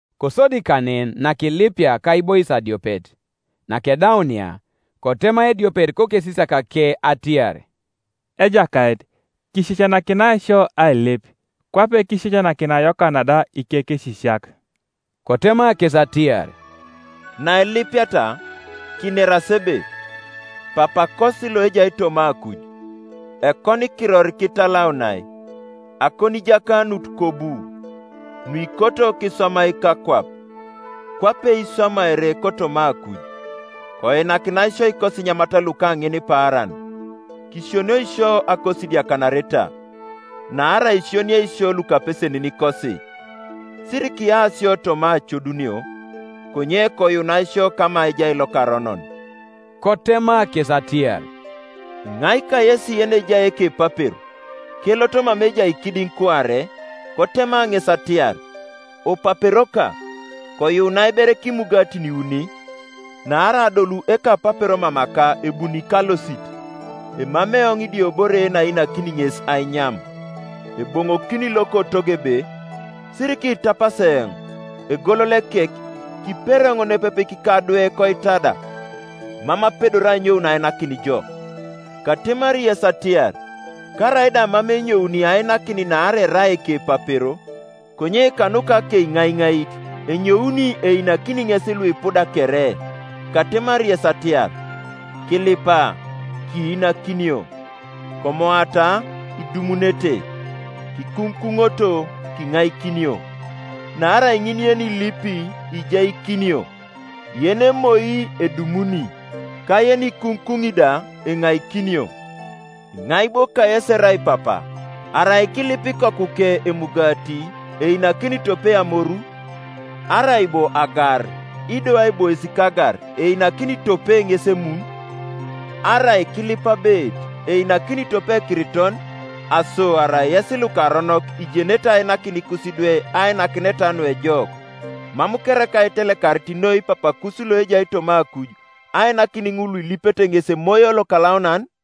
Kosodi kanen, nakilipia kaibois adiopet, nakedaunia, kotema ediopet kosesisiakake atiar, “Ejakait, kisisianakinai sio ailip, kwape kisisianakinia Yokana da ikekesisiak.” Kotema kes atiar, “Nailipiata, kineras ebe, Papakosi loejai toma akuj, ekonikiror kitalaunai. Akonijakanut kobu. Nuikoto kiswamai kakwap, kwape iswamaere kotoma akuj. Koinanakinai sio ikosinyamat luka ŋinipaaran; Kisionioi sio akosidiakanareta; naarai kisioniei isio lukapeseninikosi. Sirikiya sio toma acodunio, konye koyuunai sio kama ejai lokaronon.” Kotema kes atiar, “Iŋai kayesi yenejai ekepapero, kelot mama ejai kidiŋ kuare, kotema ŋes atiar, ‘Opaperoka, koyuunai ber kimugatin iuni; naarai adolu ekapapero mamaka ebuni kalosit, emamei eoŋ idiobore yenainakini ŋes ainyam’; eboŋokini lokotogo ebe, ‘Sirikiitapas eoŋ; egolol ekek, kiperi eoŋ nepepe kikadwe koitada; mam apedori anyoun ainakin jo’? Katemari yes atiar, Karaida mam enyouni ainakin naarai erai ekepapero, konye kanuka akeiŋaiŋait enyouni einakini ŋes luipuda kere. Katemari yes atiar, Kilipa, kiinakinio; komoata, idumunete; kikuŋukuŋoto, kiŋaikinio, Naarai ŋin yenilipi ijaikinio, yenemoi edumuni, ka yenikuŋukuŋi da enaikinio. Iŋai bo kayesi erai papa, arai kilipi ikokuke emugati, einakini tope amoru? Arai bo agar, ido aibois kagar einakini tope ŋes emun? Arai kilip abeet, einakini tope ekiriton? Aso arai yes lukaronok ijenete ainakin ikusidwe ainakineta nuejok, mam kereka itelekarit noi Papakus loejai toma akuj ainakin ŋul luilipete ŋes Emoyo Lokalaunan?”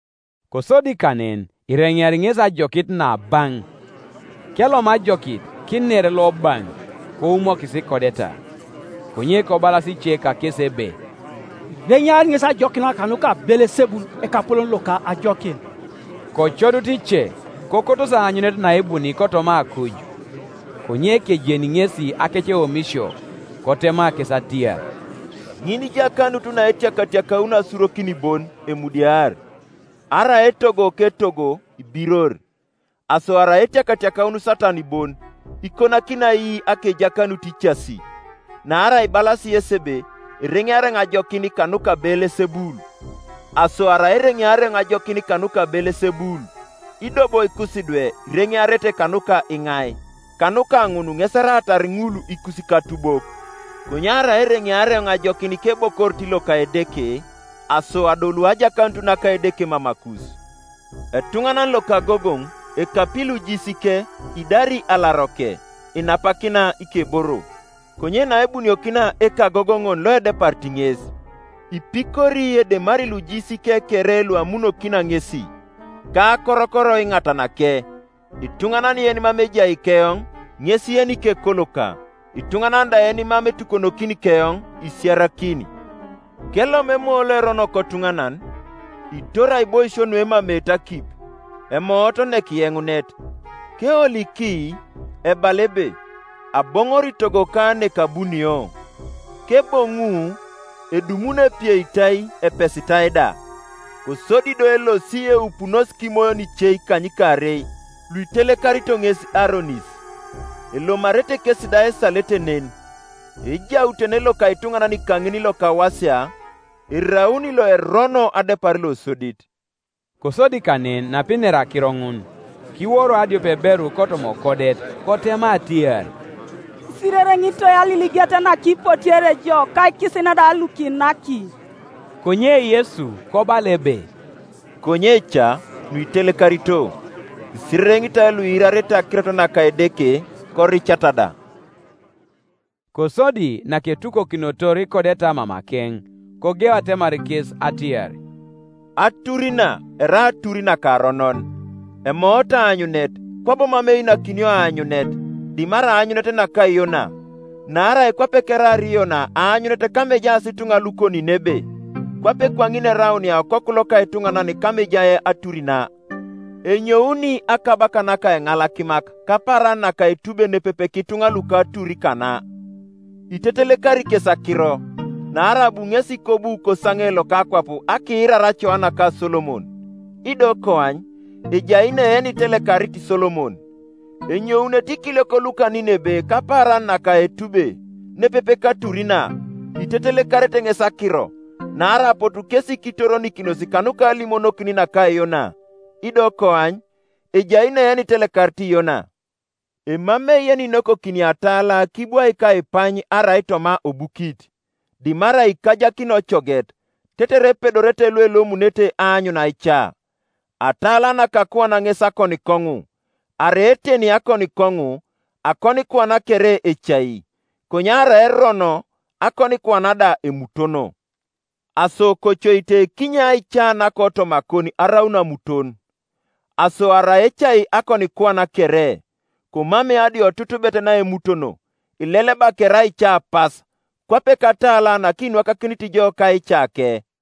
Kosodi kanen ireŋeari ŋesi ajokit nabaŋ, Kelom ajokit, kiner lobaŋ; koumokis ikodeta. Konye kobalas ice kakesi ebe, “Ireŋeari ŋesi ajokin kanuka Beelesebul ekapolon loka ajokin.” Kocodut ice, kokotosi aanyunet naebuni kotoma akuj. Konye kejeni ŋesi akeceomisio, kotema kes atiar, “Ŋinijakanut naetiakatiakaun asurokin bon emudiar; arai etogo ketogo ibiror. Aso arai etiakatiakaun Satan bon, ikonakini ai akejakanut icasi? Naarai ibalasi yesi ebe ereŋeari eoŋ ajokin kanuka Beelesebul. Aso arai ereŋeari eoŋ ajokin kanuka Beelesebul, ido bo ikusidwe ireŋearete kanuka iŋai? Kanuka ŋun ŋes eraatar ŋul ikusikatubok. Konye arai ereŋeari eoŋ ajokin kebokorit loka Edeke, aso adolu ajakanut naka Edeke mamakus, Etuŋanan lokagogoŋ ekapi lujiisike idari alaroke, inapakina ikeboro: Konye naebunokinia ekagogoŋon loedeparit ŋes, ipikori edemari lujiisike kere luamunokina ŋesi, ka akorokor iŋatanake. Ituŋanan yenimam ejai keoŋ, ŋes yenikekoloka; ituŋanan da yenimam etukonokini keoŋ, isiarakini. “Kelonu emoyo loerono kotuŋanan, itori aiboisio nuemameete akip, emoot nekiyeŋunet; keoliki, ebala ebe, ‘Aboŋori togoka nekabunio.’ Keboŋu, edumuni epieitai, epesitai da. Kosodi do elosi eupunos kimoyon ice ikanykaarei luitelekarito ŋes aronis; elomarete kesi da esalete nen; ejautene loka ituŋanan kaŋin lokawasia eraun loerono adepar losodit.” Kosodi kanen, napinera akiro ŋun, kiworo adiopeberu kotoma okodet, kotema atiar, “Isirereŋitoi aliliget nakipotiere jo, ka ikisin da lukinaki.” Konye Yesu kobala ebe, “Konye ca, nuitelekarito, isirereŋitoi luiirarete akirot naka Edeke, koricata da!” Kosodi naketukokinotor ikodeta mamakeŋ, kogeu atemar kes atiar, “Atur na erai atur nakaronon; emoot aanyunet, kwabo mam einakinio aanyunet, dimarai aanyunet naka Yona. Naarai kwape keraar Yona aanyunet kama ejaas ituŋa luko Ninebe, kwape kwaŋin eraunia Okoku loka etuŋanan kama ejai atur na. Enyouni akabaka naka Eŋalakimak kapaaran naka etube nepepe kituŋa luka atur kana, itetelekari kes akiro; naarai abu ŋesi kobu kosaŋe loka akwap akiirar acoa naka Solomon, ido koany, ejai ne yenitelekarit Solomon. Enyounete ikiliok luka Ninebe kapaaran naka etube nepepe katur na itetelekarete ŋes akiro; naarai apotu kesi kitoronikinos kanuka alimonokin naka Yona, ido koany, ejai ne yenitelekarit Yona. Emamei yeninokokini atala kibwaik aipany arai toma obukit, dimarai ikajakini ocoget, tetere epedorete luelomunete aanyun aica. Atala naka akuan ŋes akonikoŋu; arai oteni akonikoŋu, akonikuan kere ecai; konye arai erono, akonikuan da emutono. Aso kocoite kinye aica nakotomakon araun amuton. Aso arai ecai akonikuan kere, komamei adiotutubet naemutono, ileleba kere aica pas, kwape katala nakinwakakinit jo kaicake.”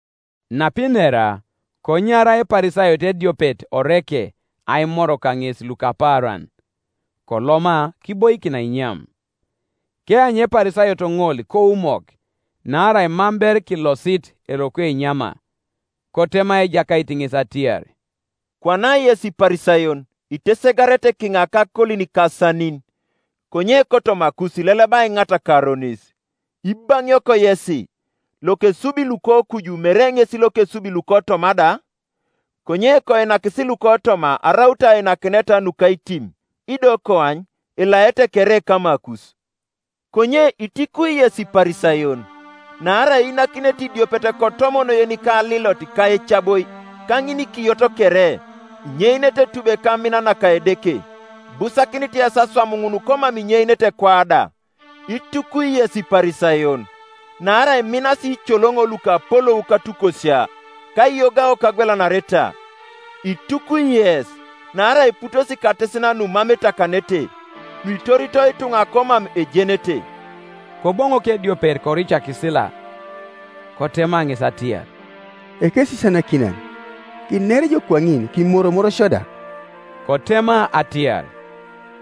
Napinera, konyara Eparisayot ediopet oreke aimor kaŋes lukapaaran; koloma kiboikin ainyam. Keanyu Eparisayot ŋol koumok, naarai mam ber kilosit eroko enyama. Kotema Ejakait ŋes atiar, “Kwana yes Iparisayon itesegarete kiŋa kakolin ka asanin, konye kotomakus ileleba aiŋat ka aronis, Ibaŋiok yesi! Lokesubi lukokuju mere ŋes lokesubi lukotoma da? Konye koinakisi lukotoma araut ainakineta nukaitim; ido koany, elaete kere kamakus. “Konye itukwi yes Iparisayon! Naarai iinanakinete idiopet kotomon yenika alilot ka ecaboi ka ŋinikiyot kere, inyeinete etube ka amin naka Edeke; ibusakinit yes aswam ŋun komam inyeinete kwa da. Itukwi yes Iparisayon! Naarai iminasi iicoloŋo lukapolou katukosia, ka aiyogao kagwelanareta. Itukwi yes! Naarai iputos katesin numam etakanete, nuitorito ituŋa komam ejenete.” Koboŋok ediopet koricakisila kotema ŋes atiar, “Ekesisianakinan, kiner ijo kwaŋin kimoromor sio da.” Kotema atiar,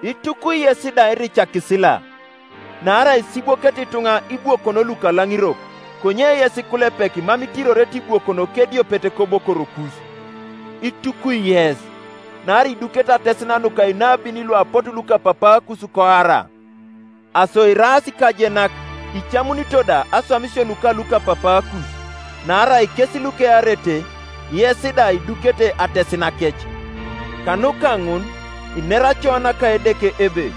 “Itukwi yes da iricakisila! Naarai isibwokete ituŋa ibwokon lukalaŋirok, konye yes ikulepek mam itirorete ibwokon kediopet kobokorokus. Itukwi yes! Naarai idukete atesin nuka inabin luapotu lukapapaakus koara. Aso iraas ikajenak icamunito da aswamisio nuka lukapapaakus; naarai kes lukearete, yes da idukete atesinakec, Kanuka ŋun inera acoa naka Edeke ebe,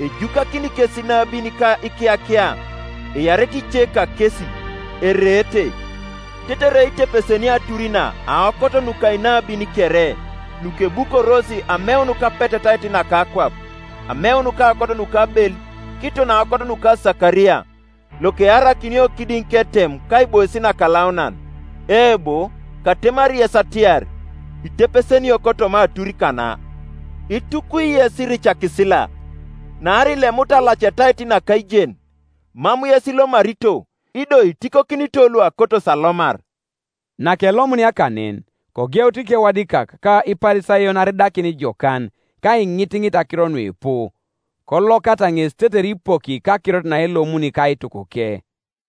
‘Ejukakini kes inabin ka ikiyakia, earete ice kakes, ereete,’ tetere itepesenio atur na aokot nuka inabi; kere, nukebukoros ameun kapetetait naka akwap, ameun kaokot nuka Abel kiton aokot nuka Sakaria, lokearakinio kidiŋ ketem ka aibois nakalaunan. Eebo, katemari yes atiar, Itepesenio kotoma atur kana. Itukwi yes iricakisila! Naarai ilemut alacetait naka aijen; mam yes ilomarito, ido itikokinito luakotos alomar.” Nakelomunia kanen, kogeut ikewadikak ka Iparisayon aridakin jokan, ka aiŋitiŋit akiro nuipu, kolokata ŋes tetere ipoki kakirot naelomuni kaitukuke.